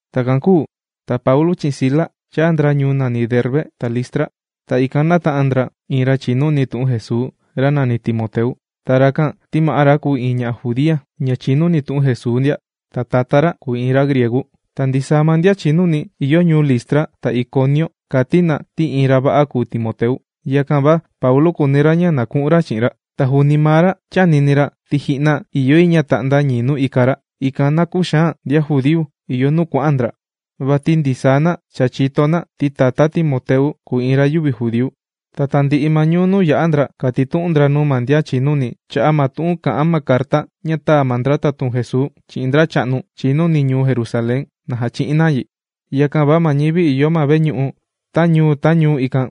Takan kūu ta Paulu chi'in Sila chāa ndra ñuu Derbe ta Listra. Ta ikan nāta'an ndra iin ra chìnuni tu'un Jesuu, ra nàni Timoteu. Ta rakan ti ma'á ra kùu iin ña judía, ña chìnuni tu'un Jesuu ndia. Ta tatá ra kùu iin ra griegu. Ta ndisaa ma ndian chìnuni ìyo ñuu Listra ta Iconiu kàti na ti iin ra va'a kùu Timoteu. Yakan va Paulu kùuni ra ña na ku'un ra chi'in ra. Va juuni maa ra chānini ti ji'na ìyo yi ña ta'nda ñii nuu ika ra, ikan na küxaan ndian judíu ìyo nuu kuà'an ndra. Vati ndisaa na cha chìto ti tatá Timoteu kùu iin ra yüvi judíu. Ta tandi'i ma ñuu nuu yà'a ndra, kàtitu'un ndra nuu ma ndian chìnuni cha'a' ma tu'un kà'an ma carta ña tāa ma ndra tatun Jesuu chi'in ndracha'nu chìnuni ñuu Jerusalén, na jachi'in na yi. Yakan va ma ñivi ìyo ma veñu'u ta ñuu ta ñuu ikan,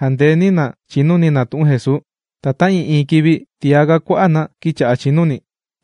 jàndeeni na chìnuni na tu'un Jesuu. Ta ta'ii'iin kivi tiaga kua'a' na kīcha'a chìnuni.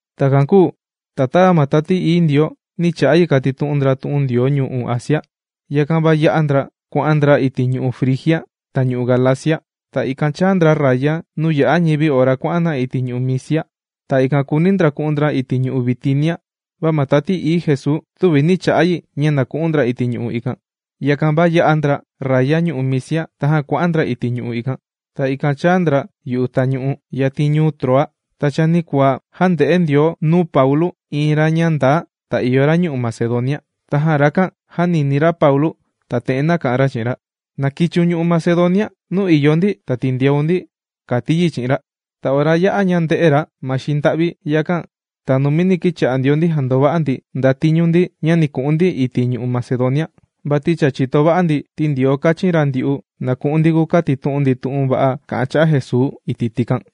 Takan kūu ta tava ma Tati Ií Ndioo nī cha'a yi kàtitu'un ndra tu'un Ndioo ñu'u' Asia, yakan va yā'a ndra kuà'an ndra iti' ñu'u' Frigia ta ñu'u' Galacia. Ta ikan chāa ndra raya nuu yà'a ñivi ora kuà'an na iti' ñu'u' Misia. Ta ikan kùuni ndra ku'un ndra iti' ñu'u' Bitinia, va ma Tati Ií Jesuu, tüvi nī cha'a yi ña na ku'un ndra iti' ñu'u' ikan. Yakan va yā'a ndra raya ñu'u' Misia tajan kuà'an ndra iti' ñu'u' ikan. Ta ikan chāa ndra yu'u tañu'u, yatin ñuu Troa. Ta chanikuaa jānde'e Ndioo nuu Paulu iin ra ña ndaa ta ìyo ra ñu'u' Macedonia. Tajan rakan jānini ra Paulu ta te'en nāka'an ra chi'in ra: “¡Na kichiun ñu'u' Macedonia, nuu ìyo ndi ta tindeun ndi!”, kàti yi chi'in ra. Ta ora yā'a ña ndē'e ra ma xinda'vi yakan, ta numini kīcha'a ndio ndi jàndova'a ndi ndatiñu ndi ña ni ku'un ndi iti' ñu'u' Macedonia, vati cha chìto va'a ndi ti Ndioo kāchin ra ndyu'u na ku'un ndi kukatitu'un ndi tu'un va'a kà'an cha'a' Jesuu iti' tikan.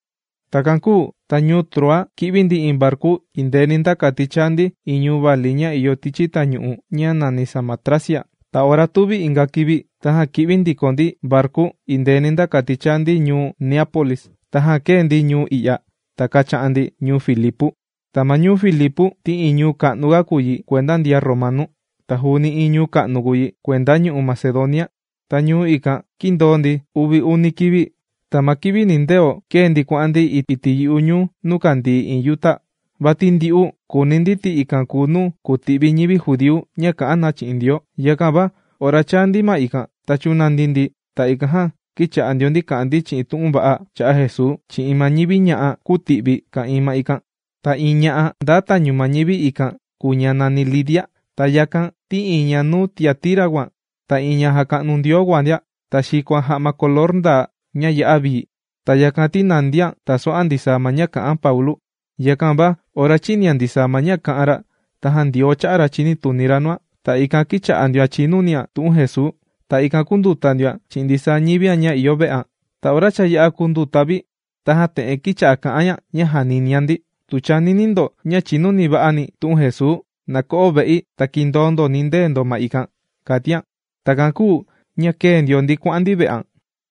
Takan kūu ta ñuu Troa kī'vi ndi iin varku indeeni nda kati chaa ndi iin ñu'u' vali ña ìyo tichi tañu'u ña nàni Samotracia. Ta ora tuvi inga kivi tajan kī'vi ndiko ndi varku indeeni nda kati chāa ndi ñuu Neápolis. Tajan kēe ndi ñuu i'ya, ta kācha'an ndi ñuu Filipu. Ta ma ñuu Filipu ti iin ñuu ka'nuga kùu yi kuenda ndian Romanu. Ta juuni iin ñuu ka'nu kùu yi kuenda ñu'u' Macedonia. Ta ñuu ikan kīndoo ndi uvi uni kivi. Ta ma kivi nindeo kēe ndi kuà'an ndi iti' yu'u ñuu nuu kàndii iin yuta. Vati ndyu'u kùuni ndi ti ikan kùu nuu kùti'vi ñivi judíu ña kà'an na chi'in Ndioo. Yakan va ora chāa ndi ma ikan ta chūnandi ndi ta ikan jan kīcha'a ndio ndi kà'an ndi tu'un va'a cha'a' Jesuu chi'in ma ñivi ña'a kūti'vi ka'ìin ikan. Ta iin ña'a ndaa tañu ma ñivi ña'a' ikan, kùu ña nàni Lidia. Ta yakan ti ña ñuu Tiatira kùan ta iin ña jàka'nu Ndioo kùan ndia. Ta xìkoan ja'ma color ndaa, ña ya'a vii. Ta yakan ti nàndian tàso'an ndisaa ma ña kà'an Paulu. Yakan va ora chīnian ndisaa ma ña kā'an ra, tajan Ndioo chā'a ra chinituni ra nuan, ta ikan kīcha'a ndioan chìnunian tu'un Jesuu. Ta ikan kūnduta ndioan chi'in ndisaa ñivian ña ìyo ve'an. Ta ora cha yā'a kūnduta vi, tajan te'en kīcha'a kà'an ña ña jàninian ndi: ―Tu chànini ndo ña chìnuva'ani̱ tu'un Jesuu, na ko'o ve'i ta kindoo ndo nindee ndo ma ikan ―kàtian. Takan kūu ña kēe ndio ndi kuà'an ndi ve'an.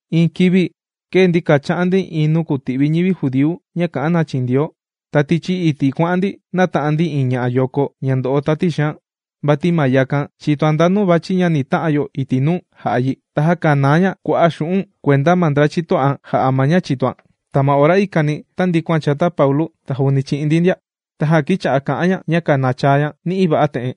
Iin kivi kēe ndi kàcha'an ndi iin nuu kùti'vi ñivi judíu ña kà'an na chi'in Ndioo. Ta tichi iti' kuà'an ndi nāta'an ndi iin ñayoko ña ndo'o tati xaan. Vati ma yakan chìtoan ndanu vàchi ma ña ni ta'an yo iti' nuu jà'a yi. Ta jākanaa ña kua'a' xu'un' kuenda ma ndra chito'an jà'a ma ña chìtoan. Ta ma ora ikani tāndikuan chata Paulu ta juuni chi'in ndi ndia. Tajan kīcha'a kà'an ña, ta kānachaa ña ni'i va'a te'en: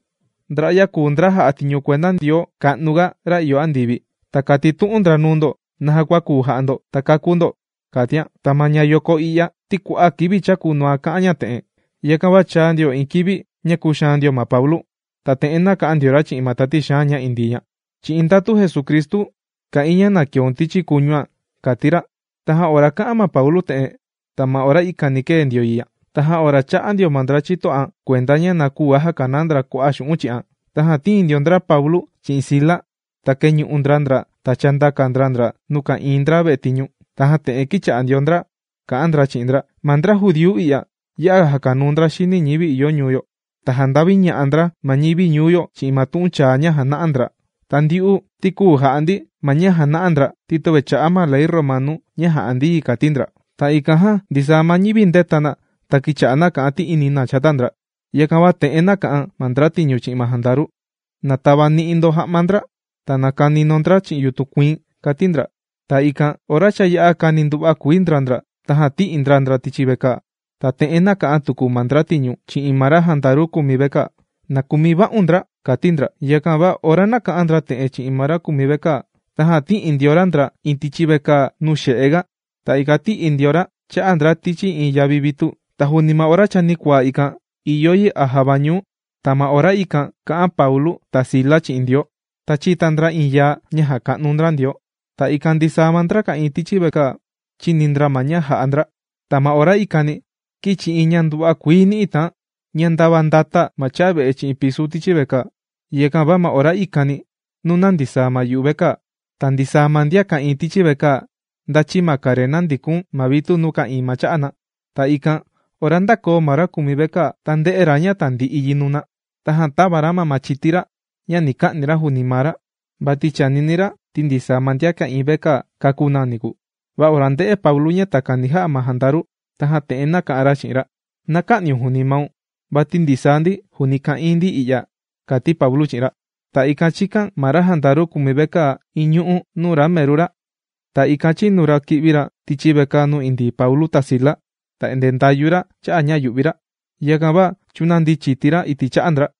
―Ndra'ya kùu ndra jà'a tiñu kuenda Ndioo ka'nu ga, ra ìyo andivi. Ta kàtitu'un ndra nuu ndo naja kua kùu jà'a ndo ta kakú ndo ―kàtian. Ta ñayoko i'ya ti kua'a' kivi chākunuan kà'an ña te'en, yakan va chāa ndio iin kivi ña kūxaan ndio ma Paulu. Ta te'en nāka'an ndio ra chi'in ma tati xaan ña indii ña: ―Chi'in ndatu Jesucristu kà'in ña na keun tichi kuñuan ―kàti ra. Tajan ora kā'an ma Paulu te'en, ta ma ora ikani kēe ndio yi ña. Tajan ora chā'a ndio ma ndra chito'an kuenda ña na küu ga jakanaa ndra xu'un' chi'an, tajan tīin ndio ndra Paulu chi'in Sila, ta kēñu'u ndra ndra ta chāndaka ndra ndra nuu ka'ìin ndra vetiñu. Tajan te'en kīcha'a ndio ndra kà'an ndra chi'in ndra: ―Ma ndra judíu i'ya ya'a jàkanuu ndra xini ñivi ìyo ñuu yo. Ta jànda'viña'a ndra ma ñivi ñuu yo chi'in ma tu'un chaa ña jàna'a ndra. Ta ndyu'u ti küu ja'a ndi ma ña jàna'a ndra ti töve chà'a ma Ley Romanu ña jà'a ndi yi ―kàti ndra. Ta ikan jan ndisaa ma ñivi ndēta na ta kīcha'a na kà'an ti'ini na chata ndra. Yakan va te'en nāka'an ma ndratiñu chi'in ma jandaru: ―Na tavani'i ndo ja'ma ndra ta na kani ndo ndra chi'in yutun kuiin ―kàti ndra. Ta ikan ora cha yā'a kāni nduva'a kuii ndra ndra, tajan tī'i ndra ndra tichi vekaa. Ta te'en nāka'an tuku ma ndratiñu chi'in ma ra jandaru kùmi vekaa: ―¡Na kumi va'un ndra! ―kàti ndra. Yakan va ora nāka'an ndra te'en chi'in ma ra kùmi vekaa, tajan tī'i ndio ra ndra iin tichi vekaa nuu xe'e ga. Ta ikan tī'i ra cha'a ndra iin tichi yavi vitu. Va juuni ma chanikuaa kivi ikan, ìyo yi a java ñuu, ta ma ora ikan kà'an Paulu ta Sila chi'in Ndioo. Ta chīta ndra iin yaa ña jàka'nu ndra Ndioo. Ta ikan ndisaa ma ndra ka'ìin tichi vekaa, chīni ndra ma ña jà'a ndra. Ta ma ora ikani kīchi iin ña nduva'a kuii ni'i tàan, ña ndava ndāta ma chave'e chi'in pisu tichi vekaa. Yakan va ma ora ikani nūna ndisaa ma yuvekaa. Ta ndisaa ma ndian ka'ìin tichi vekaa ndāchi ma karena ndìkun ma vitu nuu ka'ìin ma cha'a na. Ta ikan ora ndākoo ma ra kùmi vekaa, ta ndē'e ra ña tandi'i yi nùna. Tajan tāva ra ma machiti ra ña ni ka'ni ra juuni maa ra, vati chànini ra ti ndisaa ma ndian ka'ìin vekaa kākú na niku. Va ora ndē'e Paulu ña takan ni ja'a ma jandaru, tajan te'en nāka'an ra chi'in ra: ―Na kä'niun juuni maun vati ndisaa ndi juuni ka'ìin ndi i'ya ―kàti Paulu chi'in ra. Ta ikan chīkan ma ra jandaru kùmi vekaa iin ñu'ú nuu ra meru ra. Ta ikan chīnu ra kī'vi ra tichi vekaa nuu indii Paulu ta Sila. Ta endee ndàyu ra cha'a' ña yu'vi ra, yakan va chūnandi chiti ra iti' cha'a ndra.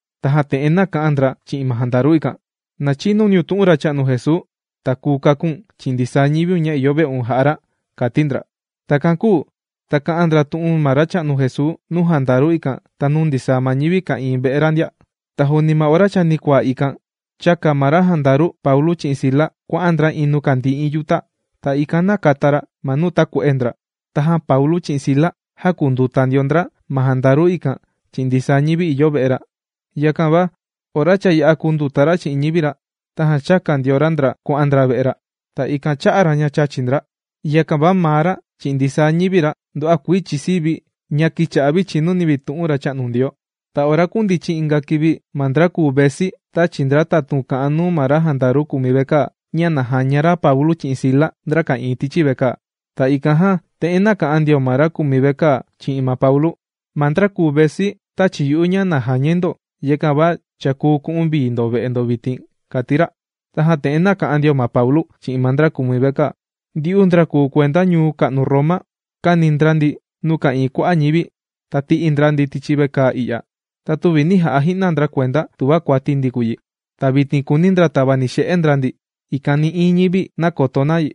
Tajan te'en nāka'an ndra chi'in ma jandaru ikan: ―¡Na chinuniun tu'un Racha'nu Jesuu, ta kuu kaku̱n chi'in ndisaa ñiviun ña ìyo ve'un jà'a ra! ―kàti ndra. Takan kūu ta kā'an ndra tu'un ma Racha'nu Jesuu nuu jandaru ikan ta nuu ndisaa ma ñivi ka'ìin ve'e ra ndia. Ta juuni ma ora chanikuaa ikan, chāka ma ra jandaru Paulu chi'in Sila kuà'an ndra iin nuu kàndii iin yuta. Ta ikan nākata ra ma nuu tàkue'e ndra. Tajan Paulu chi'in Sila jākunduta ndio ndra ma jandaru ikan chi'in ndisaa ñivi ìyo ve'e ra. Yakan va ora cha yā'a kùnduta ra chi'in ñivi ra, tajan chāka ndio ra ndra kuà'an ndra ve'e ra. Ta ikan chā'a ra ña chàchi ndra. Yakan va maa ra chi'in ndisaa ñivi ra, nduva'a kuii chìsii vi ña kīcha'a vi chìnuni vi tu'un Racha'nu Ndioo. Ta ora kūndichin inga kivi ma ndra kùu vesi tāchi ndra tatun kà'an nuu ma ra jandaru kùmi vekaa, ña na jaña ra Paulu chi'in Sila, ndra ka'ìin tichi vekaa. Ta ikan jan te'en nāka'an ndio ma ra kùmi vekaa chi'in ma Paulu: ―Ma ndra kùu vesi, tāchi yu'u ña na jañai ndo. Yakan va cha kùu ku'un vii ndo ve'e ndo vitin ―kàti ra. Tajan te'en nāka'an ndio ma Paulu chi'in ma ndra kùmi vekaa: ―Ndyu'u ndra kùu kuenda ñuu ka'nu Roma. Kāni ndra ndi nuu ka'ìin kua'a' ñivi, ta tī'i ndra ndi tichi vekaa i'ya. Ta tüvi nī ja'a ji'na ndra kuenda tuva kuati ndi kùu yi. ¡Ta vitin kùuni ndra tavani'i xe'e ndra ndi ikan nï'iin ñivi näkoto na yi!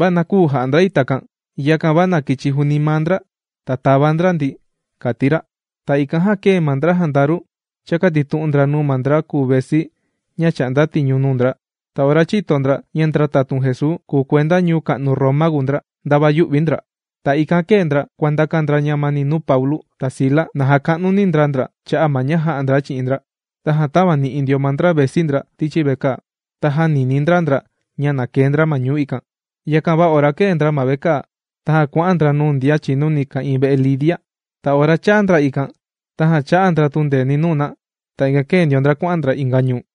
¡Va na küu ja'a ndra yi takan! ¡Yakan va na kichi juuni maa ndra ta tava ndra ndi! ―kàti ra. Ta ikan jan kēe ma ndra jandaru chākatitu'un ndra nuu ma ndra kùu vesi ña chà'nda tiñu nuu ndra. Ta ora chìto ndra ña ndra tatun Jesuu, kùu kuenda ñuu ka'nu Roma kùu ndra, ndava yū'vi ndra. Ta ikan kēe ndra kuàndakan ndra ñamani nuu Paulu ta Sila na jaka'nuni ndra ndra cha'a' ma ña jā'a ndra chi'in ndra. Tajan tāvani'i ndio ma ndra vesi ndra tichi vekaa. Ta jānini ndra ndra ña na kee ndra ma ñuu ikan. Yakan va ora kēe ndra ma vekaa, tajan kuà'an ndra nuu ndian chìnuni ka'ìin ve'e Lidia. Ta ora chāa ndra ikan tajan chā'a ndra tundeeni nuu na. Ta ikan kēe ndio ndra kuà'an ndra inga ñuu.